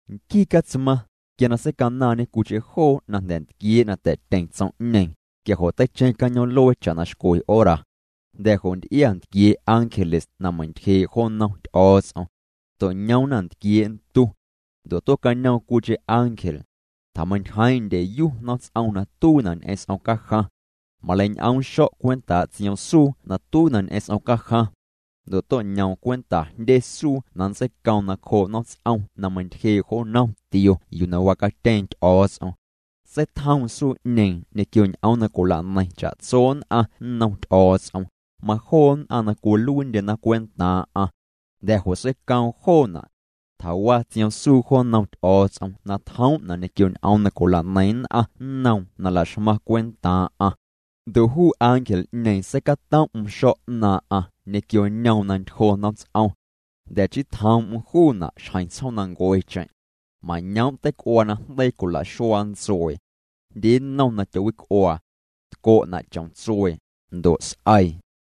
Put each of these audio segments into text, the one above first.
Nquii Catsmaⁿ, quia na seicanaaⁿñê cwiicheⁿ joo na jnda̱ ntquiee' na ta̱'tyeⁿ tsom'ñeeⁿ, quia jo' teicheⁿ cañoom'luee cha'na xcwe hora. Jnda̱ jo' nty'ia ntquiee' ángeles na meiⁿ'ntyjee' jo nnom Ty'o̱o̱ts'om. To'ñoomna ntquiee' ntu. Ndo' tue'cañoom cwiicheⁿ ángel. Tjameintyjeeⁿ'eⁿ ndyeyu nomts'om na tuiina' ñ'eⁿ s'om cajaⁿ. Maleiñ'oom xo̱' cwentaa' tsioomsuu na tuiina' ñ'eⁿ s'om cajaⁿ. Ndo' to'ñoom cwenta jndye suu na nntseicoom nacjoo' nomts'om na meintyjee' jo nnom tio yuu na wacatyeeⁿ Ty'o̱o̱ts'om. Seitjoom suu'ñeeⁿ ñequio ñ'oom na cwila'neiⁿ cha'tso nn'aⁿ nnom Ty'o̱o̱ts'om, majoo nn'aⁿ na cwiluiindyena cwentaaⁿ'aⁿ. Jnda̱ jo' seicoom joona'. Tjawa tsioomsuu'ñeeⁿ jo nnom Ty'o̱o̱ts'om na tjoom'na' ñequio ñ'oom na cwila'neiⁿ nn'aⁿ nnoom na la'xmaⁿ cwentaaⁿ'aⁿ. Ndo' juu ángel'ñeeⁿ seicatom'm xo̱' 'naaⁿ'aⁿ ñequio ñoom na ntyjo nomts'om. Jnda̱ chii tjoom'm juuna' xjeⁿ tsjoomnancuecheⁿ. Mañoom' teic'uaa na jndeii cwila'xuaa ntsuee. Jndye nnom na tyowic'uaa. Tco'na' chom tsuee, ndo' s'eii.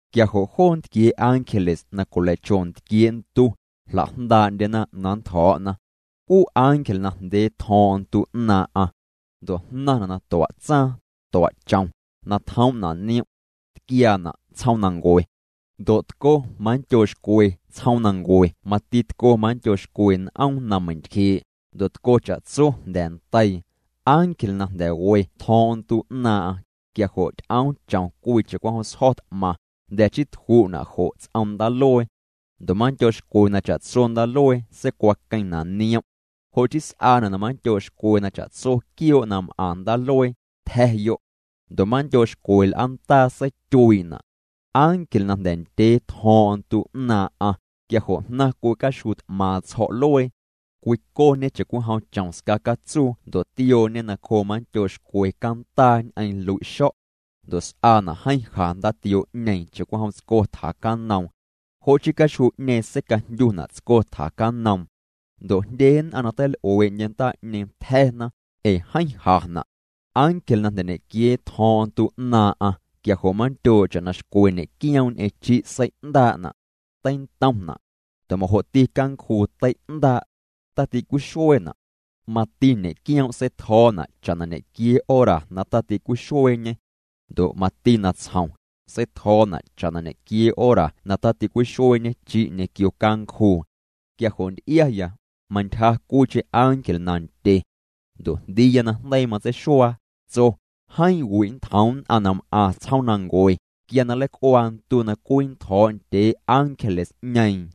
Quia jo' joo ntquiee' ángeles na cwilei'cho ntquiee' ntu, jla'jndaa'ndyena na nntjo̱o̱'na. Juu ángel najndyee tjo̱o̱ⁿ'o̱ⁿ ntu 'naaⁿ'aⁿ. Ndo' jnaⁿna' na tua' tsaaⁿ, tua' chom, na tjoom'na' niom'. Tquiaana' tsjoomnancue. Ndo' tco manndyoo' xcwe tsjoomnancue mati tco manndyoo' xcwe n'oom na meiⁿ'ntyjee', ndo' tco cha'tso jnda̱ ndeii. Ángel na jnda̱ we tjo̱o̱ⁿ'o̱ⁿ ntu 'naaⁿ'aⁿ, quia jo' ty'oom chom cwii cha'cwijom sjo̱ t'maⁿ, jnda̱ chii tju'na' jo' ts'om ndaaluee. Ndo' manndyoo' xcwe na cha'tso ndaaluee seicwaqueⁿna' niom'. Jo' chii s'aana' na manndyoo' xcwe na cha'tso quioo' na m'aⁿ ndaaluee, tja̱yo'. Ndo' manndyoo' xcwe l'aandaa seityuii'na'. Ángel na jnda̱ ndyee tjo̱o̱ⁿ'o̱ⁿ ntu 'naaⁿ'aⁿ, quia jo' jnaⁿ cwii caxjuu t'maaⁿ tsjo̱'luee. Cwicoñê cha'cwijom chom scacatsuu ndo' tiooñê nacjoo manndyoo' xcwe candaa ñ'eⁿ lui'xo̱'. Ndo' s'aana' jeeⁿ ja ndaatioo'ñeeⁿ cha'cwijom tsco tjacanoom. Jo' chii caxjuu'ñeeⁿ seicajndyuna' tsco tjacanoom. Ndo' jndye nn'aⁿ na teil'uee'ndye ndaa'ñeeⁿ, tja̱na ee jeeⁿ jana'. Ángel na jnda̱ ñequiee tjo̱o̱ⁿ'o̱ⁿ ntu 'naaⁿ'aⁿ, quia jo' manndyoo' cha'na xcwe ñe'quioom' ñ'eⁿ chi' sei'ndaa'na'. Teintomna'. Ndo' majo'ti cancjuu tei'ndaa'. Taticwixueena'. Mati ñe'quioom' seitjo̱o̱na' cha'na ñequiee hora na taticwixueeñê. Ndo' mati natsjom, seitjo̱o̱na' cha'na ñequiee hora na taticwixueeñe chi' ñequio cancjuu. Quia jo' nty'iaya, mantyja cwiicheⁿ ángel nandye. Ndo' jndiiya na jndeii matseixuaa, tso: —Jeeⁿ wi' nntjoom nn'aⁿ na m'aⁿ tsjoomnancue, quia na nleic'uaa ntu na cwinntjo̱o̱' ndyee ángeles'ñeeⁿ.